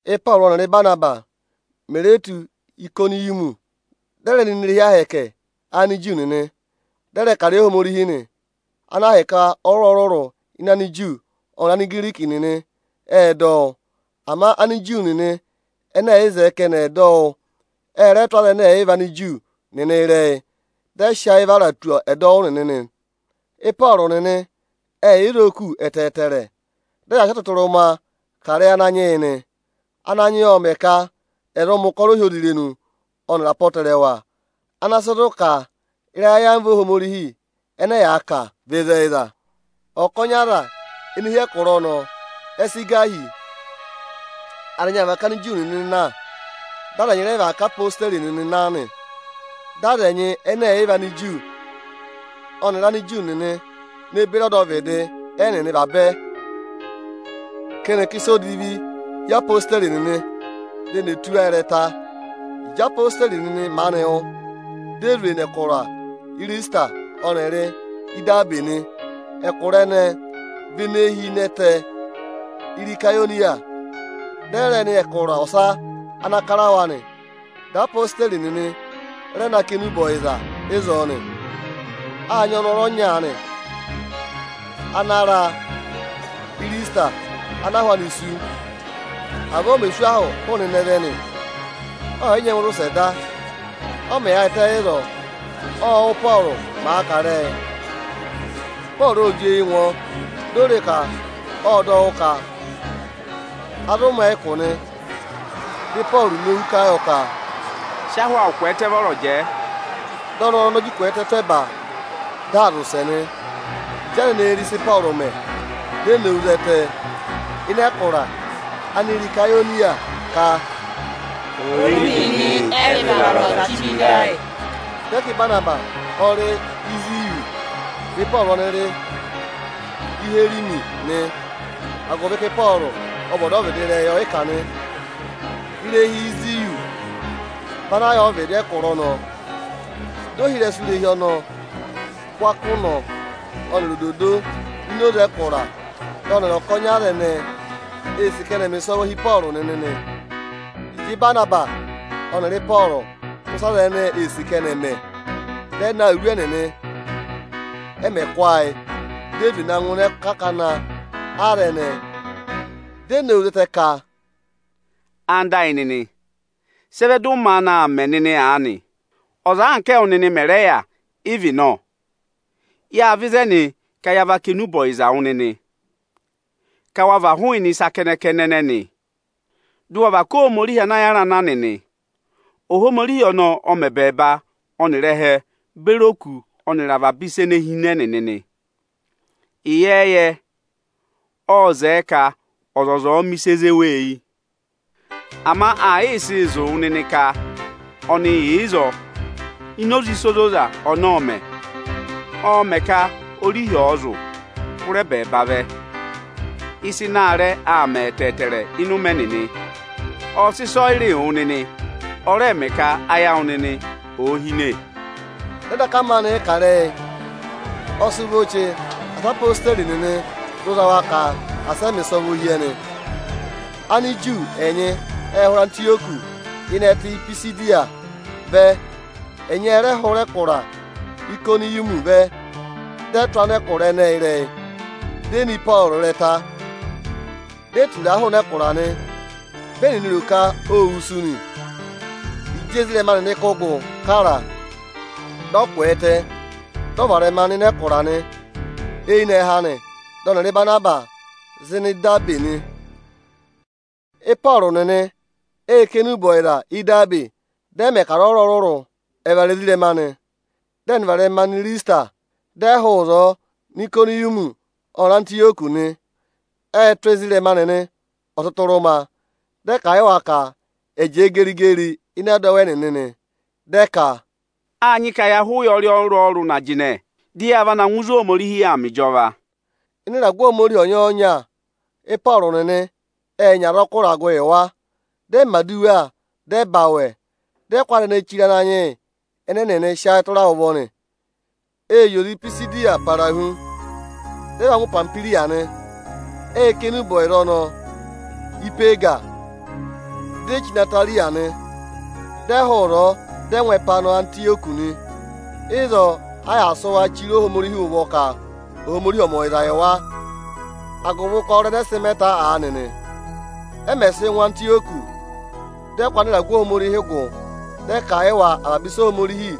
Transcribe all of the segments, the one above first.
Ị́pọọrụ ọnịrị Ịbanabasị mè re tù Ayịkọnịyọmị, ệ rẹ nọ ini irehi Ohomorihi Aniju nịnị, dị ẹ rẹ kà ịrẹyị Ohomorihi ịnị oze ana ahịka ọrụrụ-ọrụrụ Aniju ọnịrị Anigiriki nịnị ệ dọ wụ́. Ama Aniju nịnị ẹnẹ ẹ̀ yị zẹẹ ka ẹnị ẹ̀ dọ wụ́, ẹ rẹ tụ́ Anigiriki nịnị ịrẹyị, dị ẹ sị ayị vara tù ọdọwụ nịnị nị. Ịpọọrụ nịnị ệ yị yà ịzọọ kù ẹtẹẹtẹrẹ. Dị ẹyaa sị ọtụtụrụma kà ịrẹyị Ananyị yị nị. Ananyị yị ộ mẹ̀ ka ẹ̀ zụ mẹ̀ ụkọrọ ohyozirenu ọnịrị apọtẹrẹwa ana sị zụ̀ ka ịrẹyị ayamva Ohomorihi ẹnẹ ẹyaa kà vị ịzẹyịza. Ọkọnị aza ene hi ịnị ẹkụra ọnọọ ẹ sị gà hi. Aza ẹnyị ệ và ká Aniju nịnị na, dị aza ẹnyị rẹ và ká odeyi nịnị na nị. Dị aza ẹnyị ẹnẹ ẹ̀ yị vị Aniju ọnịrị Aniju nịnị ne beri ọdọvịdị ẹnịnị vabẹ, ka ẹnị ẹ̀ kà ịsa odivi hi odeyi nịnị, di eni è tụ́ wa ịrẹta. Ịjị odeyi nịnị maanị wụ́, di e zwe nọ Ịrịsịtịra ọnịrị Idabe nị. Ẹkụra ẹnẹẹ vị ene hi ịnị ẹtẹ Irakoniya. Dị ẹ rẹ nọ ẹkụra ọsa ana kara wa nị. Dị ẹyaa kà enube ọyịza ịzọọ nị. Â nyị ọnọrụ ọnya aanị ana ra Ịrịsịtịra ana ahụ anị sú. Avọọ o mè sú ahụ hụụnị ịnẹ vẹ nị; ọọ̀ yị nyẹngụ zị ụsẹ da. Ọ mẹ̀ yaayịtẹ ịzọọ, ộ wụ́, Ị́pọọrụ màa kà ịrẹyị. Ịpọọrụ ô jị eyi ngụ ọ, di o re e ka ộ dọ wụ́ ka a zụ mẹ̀ ẹ ụkụ nị. Dị Ịpọọrụ nowu kà a yọ ka, “Sị ahụ awụ kwẹẹtẹ vọrọ jẹẹ!” Dị ọnọrụ ọnọọ ji kwẹẹtẹ tụ́ ẹba, di aa zị ụsẹ nị. Ịjị aza ẹnẹẹ re ịsị Ịpọọrụ mẹ, di e nowu zẹtẹ ịnị ẹkụra Irakoniya ka, “Ori nịnị ẹ zị vara ọza chí vẹ ịdị ayị!” Dị ẹ ka Ịbanabasị ọ rị Iziyọsị, dị Ịpọọrụ ọnị rị Iherimesi nị, agụvị ka Ịpọọrụ ọ vị ọdọvịdị ịrẹyị ọyịkà nị. Irehi Iziyọsị vị ana yà ọvịdị ẹkụra ọnọọ. Di ohirẹsụ irehi ọnọọ kụ́ akọ ụnọ ọnịrị ododo nọ ini oze ẹkụra, dị ọnịrị ọkọnị aza ẹnẹẹ ee sì ka ẹnị ẹ̀ mẹ̀ ịsọvọ hi Ịpọọrụ nịnị nị. Ịjị Ịbanabasị ọnịrị Ịpọọrụ wụ́ ịsị aza ẹnẹẹ ee sì ka ẹnị ẹ̀ mẹ, dị ẹ na awuru ẹnịnị, ẹ màa kụ́ ayị, di e zwe na ngụ ịnị akakana aza ẹnẹẹ, di e nowu zẹtẹ ka, “Anda ayị nịnị, sị ẹ vẹ dị ụ maanị aa mẹ nịnị aanị? Ọza anka ẹwụ nịnị mẹ̀ rẹ yà ị vị nọ! Yâ vẹ ịzẹnị ka ya va kà enube ọyịza wụ nịnị, ka wa và hụụnị ịsa kẹnẹ-kẹnẹ ẹnẹnị, dị ụ wa và ká Ohomorihi ana yàra na nịnị! Ohomorihi ọnọọ ọ mẹ ẹbẹẹba ọnịrị ẹhẹ beri òkū ọnịrị avaba ịsa ene hi ịnị ẹnịnị nị. Ịyẹẹyẹ, ộ zẹẹ ka ọzọza ọ̀ọ mẹ ịsị èe zé wa eyi. Ama aa yịị sịị zụ̀ wụ nịnị ka ọnị yà ịzọọ ini oze ịsa ozoza ọnị ọọ̄ mẹ̀. Ọọ̄ mẹ ka orihi ọ̀ọ zụ̀ụ hụrẹ ẹbẹẹba vẹ. Ịsa ịnị aarẹ aa mẹ ẹtẹẹtẹrẹ ịnị ụmẹ ẹnịnị. Ọọ̄ sị ịsọyịrịị wụ nịnị, ọ rẹẹ̄ mẹ ka ayị awụ nịnị òo hine.” Dị ẹ daka maanị yị kà ịrẹyị, ọ sị vọ chee asị odeyi nịnị zụ za wa ka asị ẹ mẹ̀ ịsọvọ hi ẹnị. Aniju ẹnyị ệ hụrẹ Antịyọkị (ịnị ẹtẹ Ipisidiya) vẹ, ẹnyị ẹ rẹ hụrẹ ẹkụra Ayịkọnịyọmị vẹ. Dị ẹ tụ́ anẹkụra ẹnẹẹ ịrẹyị, di e ne Ịpọọrụ ịrẹta, di e tura a hụụnị ẹkụra nị. Vị ẹnịnị ro ka ô wusu nị. Ịjị ezirẹma nịnị kụ́ gụ kara a, dị ọ kwẹẹtẹ, dị ọ varẹma nọ ịnị ẹkụra nị. Eyinẹhẹ anị, dị ọnịrị Ịbanabasị zị nọ Idabe nị. Ịpọọrụ nịnị ệ kà enube ọyịza Ídabe, dị ẹ mẹ ka aza ọrụrụ ẹ̀ vara ezirẹma nị. Dị ẹnịnị varẹma nọ Ịrịsịtịra, dị ẹ hụụ ịzọọ nọ Ayịkọnịyọmị ọnịrị Antịyọkị nị. Ệ tụ́ ezirẹma nịnị ọtụtụrụma, dị ẹ kà a yị wa ka ẹ̀ jẹẹ geri-geri ịnị ẹdọwụ ẹnịnị nị. Dị ẹ ka, “Â nyị ka ya há ụyọrị ọrụrụ-ọrụrụ na jịnẹ, dị ya va na ngụ ịzị Ohomorihi yà aa mẹ ịjọva.” Ịnị ịragụ Ohomorihi ọnya-ọnya, Ịpọọrụ nịnị ệ nyị azọkụ ịragụ yị wa. Dị ẹ mẹ̀ aduwa, dị ẹ za awẹ, dị ẹ kụ́ aza ẹnẹẹ chire Ananyị yị ẹnị ẹnịnị sị ayị tụra ụvọ nị. Ệ zị oze Ipisidiya para hu, dị ẹ va ngụ Ipamihwiriya nị. Ệ kà enube ọyịza ọnọọ Ípeega, di e chí nọ Atarịya nị. Ẹnịnị ệ hụụ ịzọọ, dị ẹ ngụ ẹpa và nọ Antịyọkị nị. Ịzọọ a yà sị wa chire Ohomorihi ụvọ ka Ohomorihi ọ̀ mẹ ọyịza yị wa agụvị ụkọrọ ẹnẹẹ sị mẹ ta aanị nị. Ẹ mẹ̀ sị ngụ Antịyọkị, dị ẹ kụ́ anịragụ Ohomorihi gụ, dị ẹ kà a yị wa avaba ịsị Ohomorihi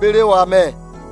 beri wa nị.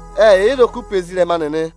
Ệ yà ịzọọ kù pe ezirẹma nịnị.